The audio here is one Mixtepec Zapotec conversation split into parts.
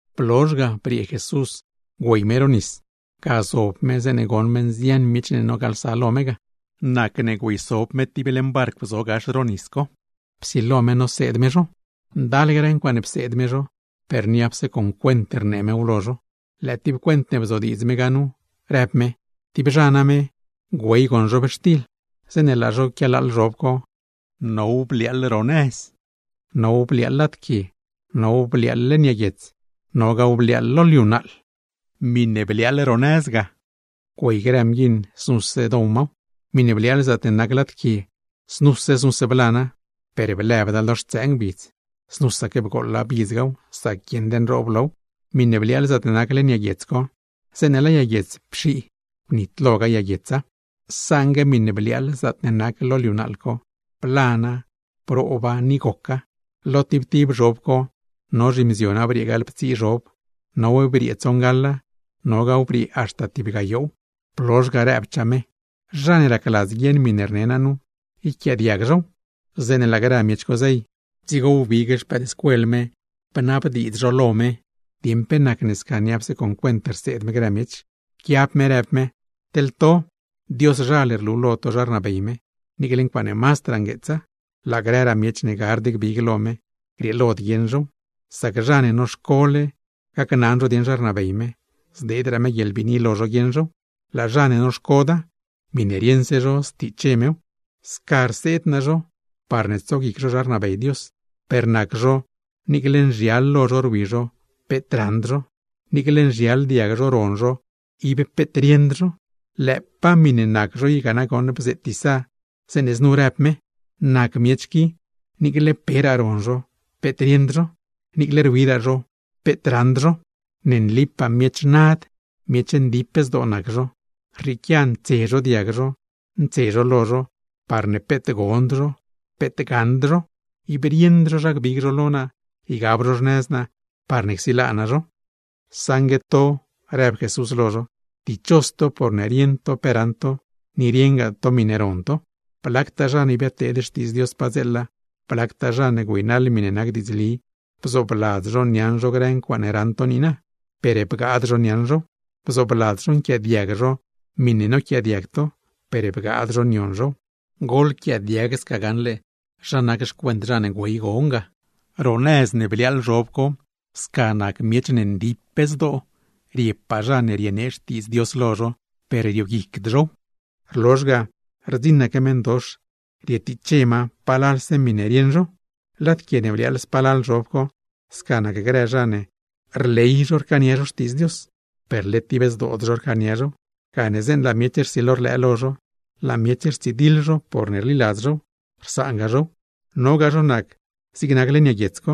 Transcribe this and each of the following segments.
Blozh ga briee Jesús güey me ro nisdoo. Ga zob me, zeeṉe goṉ me nzian miech ne nocaalsa lo me ga, nacne biep me güeysob me tib leṉ barcw zo gax ro nis co, psilo me pseed me zho. Ndal grë ncuaaṉe pseed me zho, per niapse con cuent rnee mew lo zho. Lëë tib cuent ne bzodiidz me ga nu, rëb me: ―Tib zha name güey gon zhobxtil. Zeeṉe laa zho quialaaḻ zhob co, now bliaaḻ gax ro nëz, now bliaaḻ lad quie, now bliaaḻ leṉ yag guiets. Miṉe bliaaḻ gax ro nëz ga, güey grë mguiṉ znuse dow maw. Miṉe bliaaḻ zaatne nac lad quie, znuse znuse blana, per zeeṉe laa lo ngbidz briee, znusaque bgooḻa, bidzgaw; sac guieṉd nroob low. Miṉe bliaaḻ zaatne nac leṉ yag guiets co, zeeṉe laa yag guiets pxii, bnitlogaw. Saṉgue miṉe bliaaḻ zaatne nac lo liu naaḻ, blana, brooba ni goca; lo tib tib zhob co no zhimziona briee gaḻptsii zhob, now briee tsoṉgaḻa, nogaaw briee haxta tib gayoow. Blozh ga, rëbchaa me: ―Zha ne racladz guieṉ miṉe rne naa nu, yquiaadiag zhow. Zeeṉe laa grë miech co zey, dzigo wbig xpëëdscuel me bnabdiidz zho lo me dieṉ pe nac ne sca niapse con cuent rseed me grë miech. Pquiab me rëb me: ―Teḻ to, Dioszhal rlu lo to zha rnabey me, niicle ncuaaṉe mazdraa ngueetsa; laa grëraa miech ne gard gbig lo me, grieelod guieṉ zhow. Sac zha ne noxcole dieṉ zha rnabey me, zdeedraa me guieḻbiini lo zho guieṉ zhow, laa zha ne noxcoda, miṉe rieṉse zho, stiche mew. Sca rseed naa zho parne tsoguic zho zha rnabey Dios, per nac zho niicle nzhial lo zho rwi zho, per peet raṉd zho; niicle nzhial diag zho per peet rond zho; ib peet rieṉd zho. Lëë miṉe nac zho i bzeet Isá, zeeṉe znu rëb me: Nac miech qui, niicle peraa ron zho, per peet rieṉd zho; niicle rwiraa zho, per peet raṉd zho. Ne nlipaa miech nad, miech ndip zdoo nac zho, rrieequia ntse zho diag zho, ntse zho lo zho; parne peet gond zho, peet gaṉd zho. Ib rieṉd zho zha gbig zho lo naa, ygab zho xnëz naa, parne csilaa naa zho. ’Saṉgue to ―rëb Jesús lo zho―. ¡Dichos to porne rieṉ to pe raṉ to, ni rieṉgaa to miṉe ron to! Blactaa zha ne biadteed xtiidz Dios padzeela, blactaa zha ne güeynaḻ miṉe nac diidzli, bzoobladz zho niaṉ zho grë ncuaaṉe raṉ to niina, per bgaad zho niaṉ zhow; bzoobladz zho nquiaadiag zho grë ncuaaṉe noquiaadiag to, per bgaad zho nion zhow. ’Goḻquiaadiag sca gaṉle zha nac xcuent zha ne güey gon ga. Ro nëz ne sca bliaaḻ zhob co, sca nac palal miech ne riepaa zha ne rienee Xtiidz Dios lo zho, per rioguicd zhow, rlozh ga rdziṉaque meṉdox, rietiche ma teḻ palalse miṉe rieṉ zho. Lad quie ne bliaaḻ spalal zhob co, sca nac grë zha ne rley rcaania Xtiidz Dios; per led dib zdood zho rcaania zhow, gane zeeṉe laa miech rsilo rlëë lo zho, laa miech rtsidiḻ zho porne rliladz zhow, rsaanga zhow. Nogaa zho nac zig nac leṉ yag guiets co.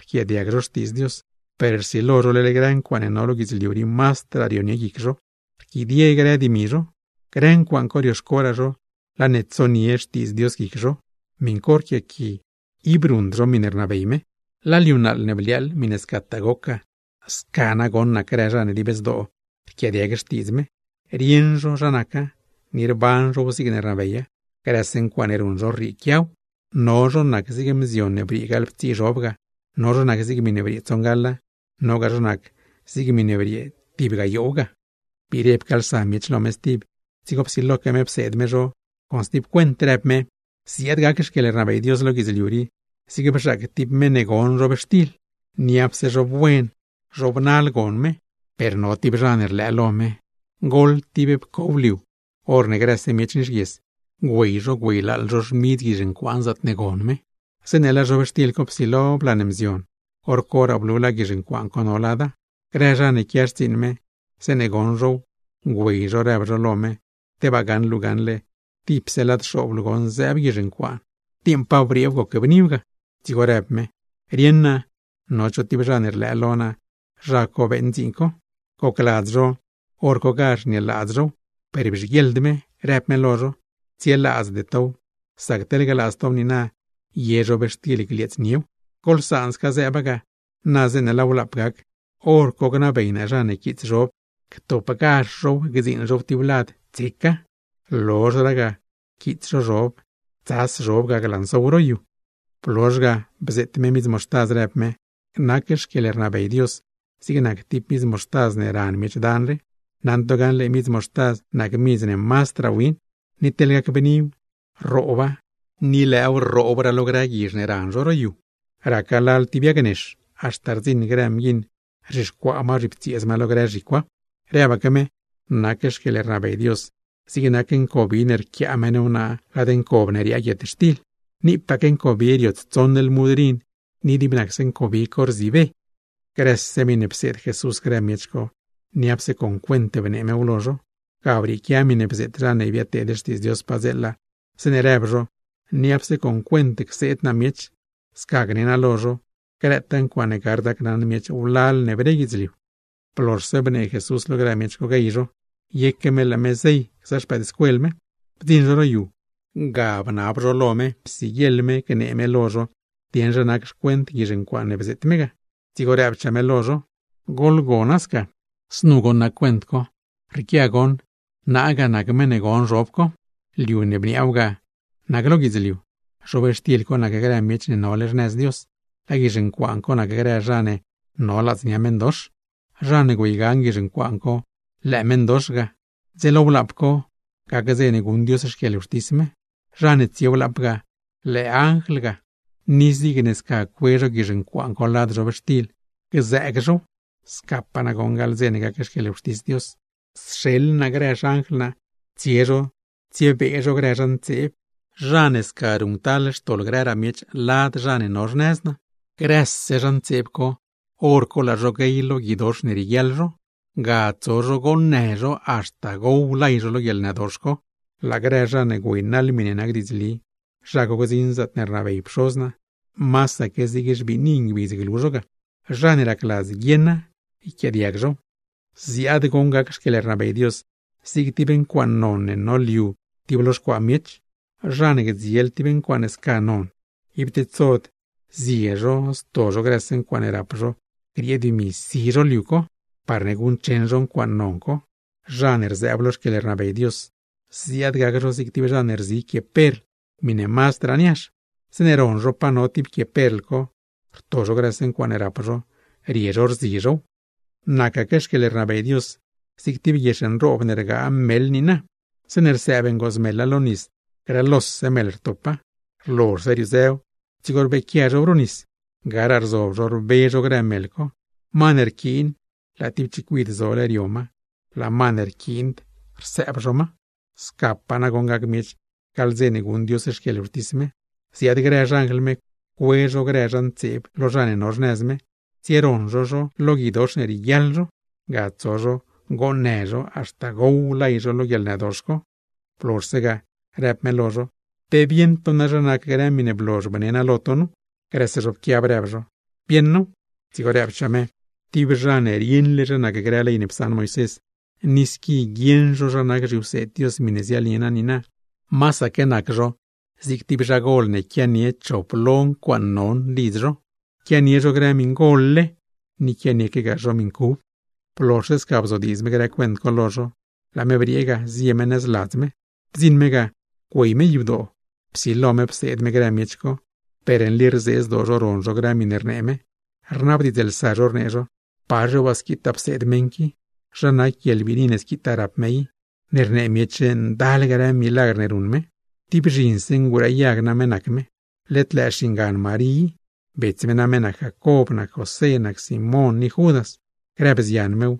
Rquiaadiag zho Xtiidz Dios, per rsilo zho leḻ grë ncuaaṉe no lo guidzliu rii mazdraa rionie guic zho, rquidie grë dimi zho. Grë ncuaaṉ co rioxcoraa zho, laa ne tsonie Xtiidz Dios guic zho, miṉ co rquiaqui ib ruṉd zho miṉe rnabey me. Laa liu naaḻ ne bliaaḻ miṉe scataa goc ga, sca nac grë zha ne dib zdoo rquiaadiag Xtiidz Dios, rieṉ zho zha naca, ni rban zhow zigne rnabeya. Rrieequia grë ncuaaṉe ruṉ zho, no zho nac zig mzion ne briee gaḻptsii zhob ga, no zho nac zig miṉe briee tsoṉgaḻa, nogaa zho nac zig miṉe briee tib gayoow ga. Biire pcaalsa miech lo me stib, dzigo psiloque me pseed me zho con stib cuent, rëb me: ―Ziaad gac xquieḻrnabey Dios lo guidzliu rii zig bzhaac tib meṉ ne gon zhobxtil. Niapse zhob wen, zhob nal gon me, per no tib zha ne rlëë lo me, goḻ tib pcow liu, horne grëse miech nixguies, güey zho güeylaaḻ zho xmidz guizh ncuaan zaatne gon me. ’Zeeṉe laa zhobxtil co psilo blan mzion, hor coraa blu laa guizh ncuaan co no lada. Grë zha ne quia xtsiiṉ me, zeeṉe goṉ zhow güey zho rëb zho lo me: “Tebaa gaṉ luu gaṉle, dipse lad xoob luu zëëb guizh ncuaan, ¿dieeṉ pa brieew gocbniw ga?” Dzigo rëb me: “Rieṉ naa no cho tib zha ne rlëë lo naa, zha co beeṉ dziin co.” ’Gocladz zho, hor cogazh nielaadz zhow per bzhiguieḻd me, rëb me lo zho: “Tsielaadzde tow, sac teḻ glaadz tow niina ye zhobxtil gliaadzniew. Goḻsaan sca zëëba ga, na zeeṉe laa wlaap gac, hor co gnabey naa zha ne quiits zhob, ctopgazh zhow gdziiṉ zhow tib lad tseca; lozhraa ga quiits zho zhob, tsasa ga, glansow ro yu.” Blozh ga bzeet me midz moxtaz, rëb me: ―Nac xquieḻrnabey Dios zig nac tib midz moxtaz ne ran miech dan rii. Naṉ to gaṉle midz moxtaz nac midz ne mazdraa win, ni teḻ gacbniw, rrooba ni lëëw rroobraa lo grë guizh ne ran zho ro yu, raca lal tib yag nex, haxta rdziṉ grë mguiṉ rzhixcuaa ma zhiptsieez ma lo grë zhicwa. Rëbaque me: ―Nac xquieḻrnabey Dios zig nac ncobi ne rquiaa meṉ wnaa lad ncob ne riaa guietxtil. Niipaque ncobi riots tsoṉ lmud rin, ni dib nacse ncob co rzibe. Grëse miṉe pseed Jesús grë miech co, niapse con cuent bnee mew lo zho. Ga brieequia miṉe bzeet zha ne biadteed xtiidz Dios padzeela, zeeṉe rëb zho: “Niapse con cuent cseed naa miech, sca gnee naa lo zho grëtaa ncuaaṉe gard gacnaṉ miech wlal ne bre guidzliu.” Blozhse bnee Jesús lo grë miech co guey zho, yeque me laa me zey gza xpëëdscuel me. Bdziṉ zho ro yu, ga bnab zho lo me siguieḻ me gnee me lo zho dieṉ zha nac xcuent guizh ncuaan ne bzeet me ga. Dzigo rëbchaa me lo zho: ―Goḻgona sca, znu goṉ nac cuent co. Rrieequia goṉ naa ga nac meṉ ne gon zhob co. Liu ne bniaaw ga, nac lo guidzliu, zhobxtil co nac grë miech ne nole xnëz Dios, laa guizh ncuaan co nac grë zha ne no ladznia meṉdox. Zha ne güeygan guizh ncuaan co, lëë meṉdox ga. Dze lo wlaap co, gac dze ne guṉ Dios xquieḻwxtis me, zha ne tsie wlaap ga, lëë anjl ga. Ni zigne sca cuee zho guizh ncuaan co lad zhobxtil, gzëëg zhow, scapaa nagoṉ gaḻ dze ne gac xquieḻwxtis Dios, sxeḻ naa grë xanjl naa tsie zho tsiebee zho grë zha ntseeb, zha ne sca ruṉctal xtoḻ grëraa miech, lad zha ne no xnëz naa. ¡Grëse zha ntseeb co, hor co laa zho guey lo guidox ne rieguiaḻ zho! Ga tso zho goonnë zho, haxta gow lay zho lo guieḻnëdox co. Laa grë zha ne güeynaḻ miṉe nac diidzli, zha co gdziṉ zaatne rnabey Pxoz naa, masaque zig xbiini ngbidz glu zho ga. ¡Zha ne racladz guieṉa yquiaadiag zhow! ’Ziaad gac xquieḻrnabey Dios zig tib ncuaaṉ non ne noliu tib lo xcuaa miech. Zha ne gdziel tib ncuaaṉe sca non, ib tedsod zie zho sto zho grëse ncuaaṉe rap zho griee dimi si zho liu co, parne guṉcheṉ zho ncuaaṉ non co. ’Zha ne rzëëb lo xquieḻrnabey Dios ziaad gac zho zig tib zha ne rzi quie perl miṉe mazdraa niazh. Zeeṉe ron zho pa no tib perl co, rto zho grëse ncuaaṉe rap zho, rie zho rzi zhow. ’Nacaque xquieḻrnabey Dios, zig tib guiex nroob ne rgaa meḻ niina, zeeṉe rsëëb ngooz meḻa lo nis grë lose meḻ rtopa. Rlozhse riodzëw, dzigo rbeequia zhow ro nis, garaa rzob zho rbe zho grë meḻ co; ma ne rquiin laa tib chicuid zole rio ma, laa ma ne rquiind rsëëb zho. Scapaa nagoṉ gac miech gaḻ dze ne guṉ Dios xquieḻwxtis me, ziaad grë xanjl me cuee zho grë zha ntseeb lo zha ne no xnëz me, tsieroṉ zho zho lo guidox ne rieguiaḻ zho. Ga tso zho goonnë zho, haxta gow lay zho lo guieḻnëdox co. Blozhse ga, rëb me lo zho: ―¿Pe bieṉ to na zha nac grë miṉe blozh bne naa lo to nu? Grëse zho pquiab rëb zho: ―Bieṉ now. Dzigo rëbchaa me: ―Tib zha ne rieṉle zha nac grë ley ne psaṉ Moisés, ni squi guieṉ zho zha nac zhiwseed Dios miṉe ziaḻnie naa niina, masaque nac zho zig tib zha gol ne quianie chop lo ncuaaṉ non lidz zho, quianie zho grë miṉ gol-le ni quianiequegaa zho miṉ cub. Blozhse sca bzodiidz me grë cuent co lo zho, laa me briee ga zie me nëz ladz me. Bdziṉ me ga güey me yadoo, psilo me pseed me grë miech co. Per nli rzee zdoo zho ron zho grë miṉe rnee me, rnabdiidzlsa zho rnee zho: ―¿Pazhe waa squitaa pseed meṉ qui? ¿Zha nac guieḻbiini ne squitaa rap me i, ne rnee miech ndal grë milagr ne ruṉ me? Tib zhinse ngurëëyag name nac me. Led lëë xingan Marí i, bets me name nac Jacob, nac José, nac Simón ni Judas; grë bzian mew,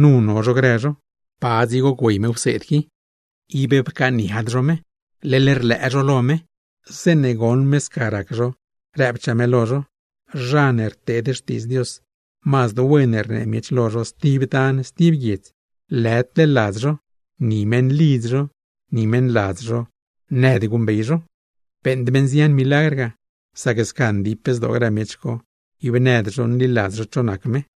nu no zho grë zho. ¿Pa dzigo güey me wseed qui? Ib beeṉcasd zho me, haxta rlëë zho lo me. Zeeṉe goṉ me sca rac zho, rëbchaa me lo zho: ―Zha ne rteed xtiidz Dios, mazd wen rnee miech lo zho stib dan, stib guiedz, lëdle ladz zho ni meṉlidz zho ni meṉladz zho nëd guṉbey zho. Beeṉd me nzian milagr ga, sac sca ndip zdoo grë miech co ib nëd zho nliladz zho cho nac me.